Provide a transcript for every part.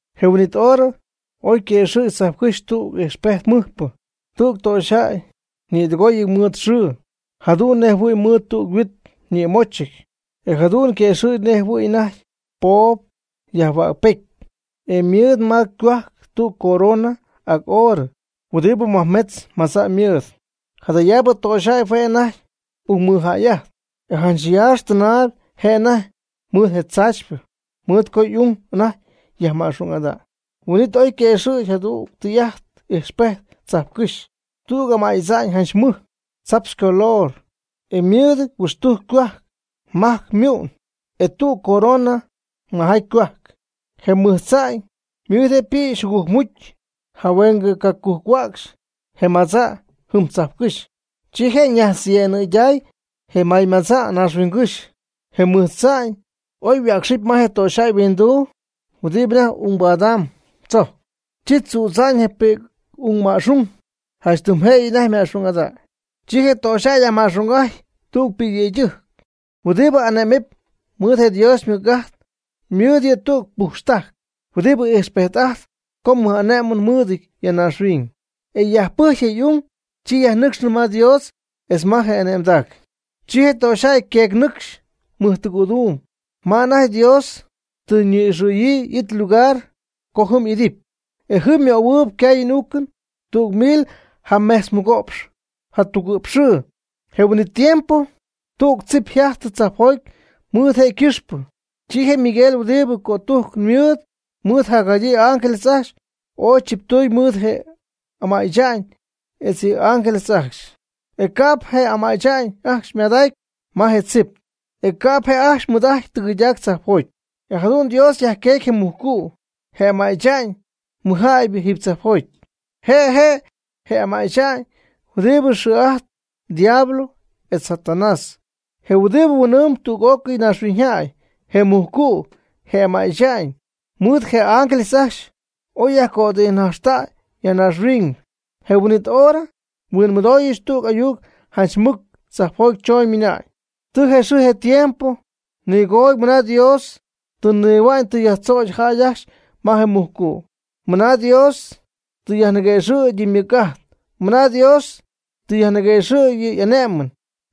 Je huin'it hora oy yquëxɨ̈gy tzajpcɨ́xy tüg ijxpejt mɨjpɨ. Tüg töxyjäy ñïdɨgooyɨty mɨɨd xɨɨ, jadu'n nej jɨhuɨ̈y mɨɨd tüg huit ñïmochɨty, e jadu'n yquëxɨ̈gy nej jɨhuɨy anajty po' yajhuäcpety, e ymɨɨd ma ycohuajc tüg corona ac oorɨ huɨdibɨ majmetz madza' mɨɨd. Jadayaabɨ töxyjäy hue' anajty ungmɨjäy'ajtp, e janch yaax tɨnaayb je' anajty mɨɨd je tzaachypɨ, mɨɨd co y'ung anajty yajma'xung'ada'ñ. Huin'it oy yquëxɨ̈gy jadüg tɨy'ajt ijxpejt tzajpcɨ́xy. Tüg ama'y tza'ñ janch mɨj, tzaptz ycolor, e mɨɨdɨty huixtujc ycohuajc, majc ymu'n, e tüg corona majaty ycohuajc. Je mɨj tza'ñ mɨɨd je' ypïxy jugujcmujcy jahueng cacujc-huäcxy je madza' jɨm tzajpcɨ́xy. Chi je' najtzyemɨyday je maymadza' naaxhuiñygɨ́xy. Je mɨj tza'ñ oy yhuäcxɨpy ma je töxyjäy yhuinduu huɨdibɨ anajty ungbadamb tzojc, chi tzüdza'ñ je pi'c'ungma'xung janch tɨm jëyɨ anajty yma'xung'aty. Chi je töxyjäy yajma'xung'ajty tüg pi'cyëydɨjc, huɨdibɨ ane'mɨp mɨɨd Dios ymɨc'ajt, ymɨɨd yɨ' tüg pujxtajc huɨdibɨ ijxpejt ajt co mɨj ane'mɨn mɨɨdɨty ya naaxhuiñ. E yajpɨjcy je y'ung, chi yajnɨcxɨ ma Dios etz ma je' y'ane'mdac. Chi je töxyjäy yqueecy ñɨcxy mɨjtɨgɨ̈duum, ma anajty Dios tɨ ñi'ixɨ̈yii y'it ylugar co jɨm y'idɨpy, e jɨm ymöhuɨɨyb ycaayɨn y'uucɨn tüg mil jamejtzmɨgo'px jatugɨ'px xɨɨ. Je huin'it tiempo tüg tzip yjajtɨ tzajpjoty mɨɨd je' ycɨxpɨ. Chi Miguel huɨdi mɨj cötujcɨn mɨɨd, mɨɨd jadyii y'ángeles ajcxy, ooy chiptuñ mɨɨd je ama'y tza'ñ etz yɨ' y'ángeles ajcxy. E ca'p je ama'y tza'ñ ajcxy ymadacy ma je tzip, e ca'p je' ajcxy mɨɨd'ajty tɨgɨydac tzajpjoty. E jadu'n Dios yajqueecy je mujcu', je ama'y tza'ñ mɨjjäybɨ, jiiby tzajpjoty. Je' je' je ama'y tza'ñ huɨdibɨ xɨɨ'ajtp diablo etz Satanás, je huɨdibɨ huin'ɨɨmb tüg'ócɨy naaxhuiñyjäy. Je mujcu', je ama'y tza'ñ, mɨɨd je' y'ángeles ajcxy oy yajcötijnajxtäy ya naaxhuiñ. Je huin'it hora nhuinmɨdooyɨch tüg ayuc janch mɨc tzajpjoty chooñ, ymɨnañ: ―Tɨ je xɨɨ je tiempo nigoody mɨna Dios tɨ nihua'ñ tɨ yajnïdzögy jäy ajcxy ma je mujcu'; mɨna Dios tɨ yajniguëxɨ̈gy yɨ' ymɨc'ajt; mɨna Dios tɨ yajniguëxɨ̈gy yɨ' y'ane'mɨn;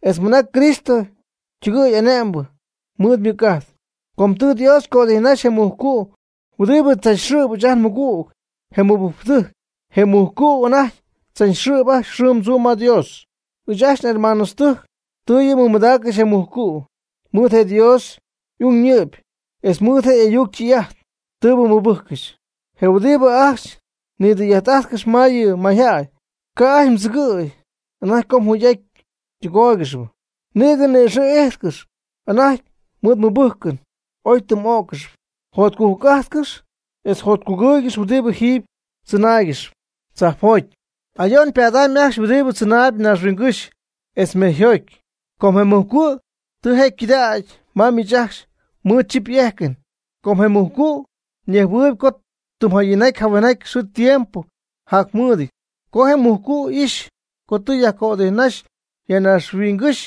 etz mɨna Cristo ytɨgɨɨy ane'mbɨ mɨɨd ymɨc'ajt. Com tɨ Dios cötijnaxy je mujcu' huɨdibɨ tzachxɨ̈p ɨɨch ajt nmɨgügtɨjc, je mɨbɨjcpɨdɨjc. Je mujcu' anajty tzachxɨ̈p ajcxy xɨɨm tzuum ma Dios. Ɨɨch ajcxy nhermanotɨjc tɨ yɨ' mɨmadaaccɨxy je mujcu' mɨɨd je Dios y'ung ñɨ'py, etz mɨɨd je' y'ayuc ytɨy'ajt tɨɨbɨ mɨbɨjccɨxy, je huɨdibɨ ajcxy nidɨy'ajtcɨxp ma yɨ mayjäy. Ca' ajcxy tzɨgɨ̈y anajty co yjugy'ajt ytɨgóoygɨxɨp. Nïgɨ ni'ixɨ̈ y'ijtcɨxy anajty mɨɨd ymɨbɨjcɨn oy ytɨmy'ó'ccɨxɨpy. Jotcujc'ajtcɨx etz jotcugɨɨygɨx huɨdibɨ jiiby tzɨnaaygɨxp tzajpjoty. Ayo'n ypadamyb ajcxy huɨdibɨ tzɨnaayb naaxhuiñygɨ́xy etz mejyjoty. Com je mujcu' tɨ je' ycɨdägy ma miich ajcxy mɨɨd chip y'ejcɨn. Com je mujcu' ñejhuɨɨyb co tɨm jayinjaty jahuenjaty xɨɨ tiempo jacmɨɨdɨty. Co je mujcu' ijxy co tɨ yajcötijnaxy ya naaxhuiñygɨ́xy,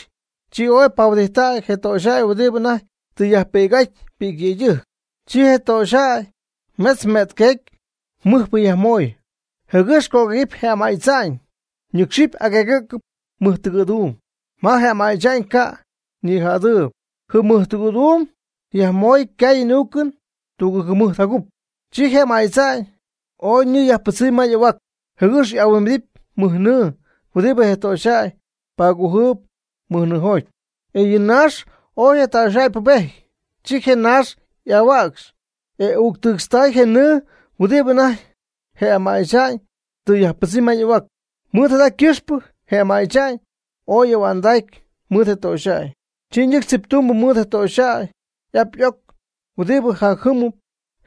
chi ooy pahuɨdijttacy je töxyjäy huɨdibɨ anajty tɨ yajpi'c'aty pi'cyëydɨjc. Chi je töxyjäy metz me'tyqueec mɨjpɨ yajmoy, jɨgɨx cöguëgɨpy je ama'y tza'ñ, ñɨcxɨp agueegɨ̈ccɨp mɨjtɨgɨ̈duum ma je ama'y tza'ñ ca' ñijädɨɨby. Jɨm mɨjtɨgɨ̈duum yajmoy ycaayɨn y'uucɨn tugɨɨg jɨmɨjt ja cup. Chi je ama'y tza'ñ ooy nɨɨ yajpɨdzɨmy ma y'ahuac, jɨgɨx y'ahuimbidɨpy mɨj nɨɨ huɨdi je töxyjäy pagujɨp mɨj nɨɨjoty. E yɨ naax ooy je töxyjäy pubejty, chi je naax y'ahuäcxy, e uuctɨɨtztay je nɨɨ huɨdibɨ anajty je ama'y tza'ñ tɨ yajpɨdzɨmy ma y'ahuac. Mɨɨd jada ycɨxpɨ je ama'y tza'ñ ooy y'ahua'ndacy mɨɨd je töxyjäy, chi ñɨcxy tziptumbɨ mɨɨd je töxyjäy y'ap y'oc huɨdibɨ jacjɨmɨp,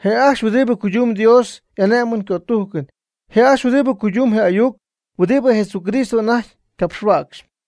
je' ajcxy huɨdibɨ cuydumb Dios y'ane'mɨn ycötujcɨn, je' ajcxy huɨdibɨ cuydumb je ayuc huɨdibɨ Jesucristo anajty capxhuäcxyp.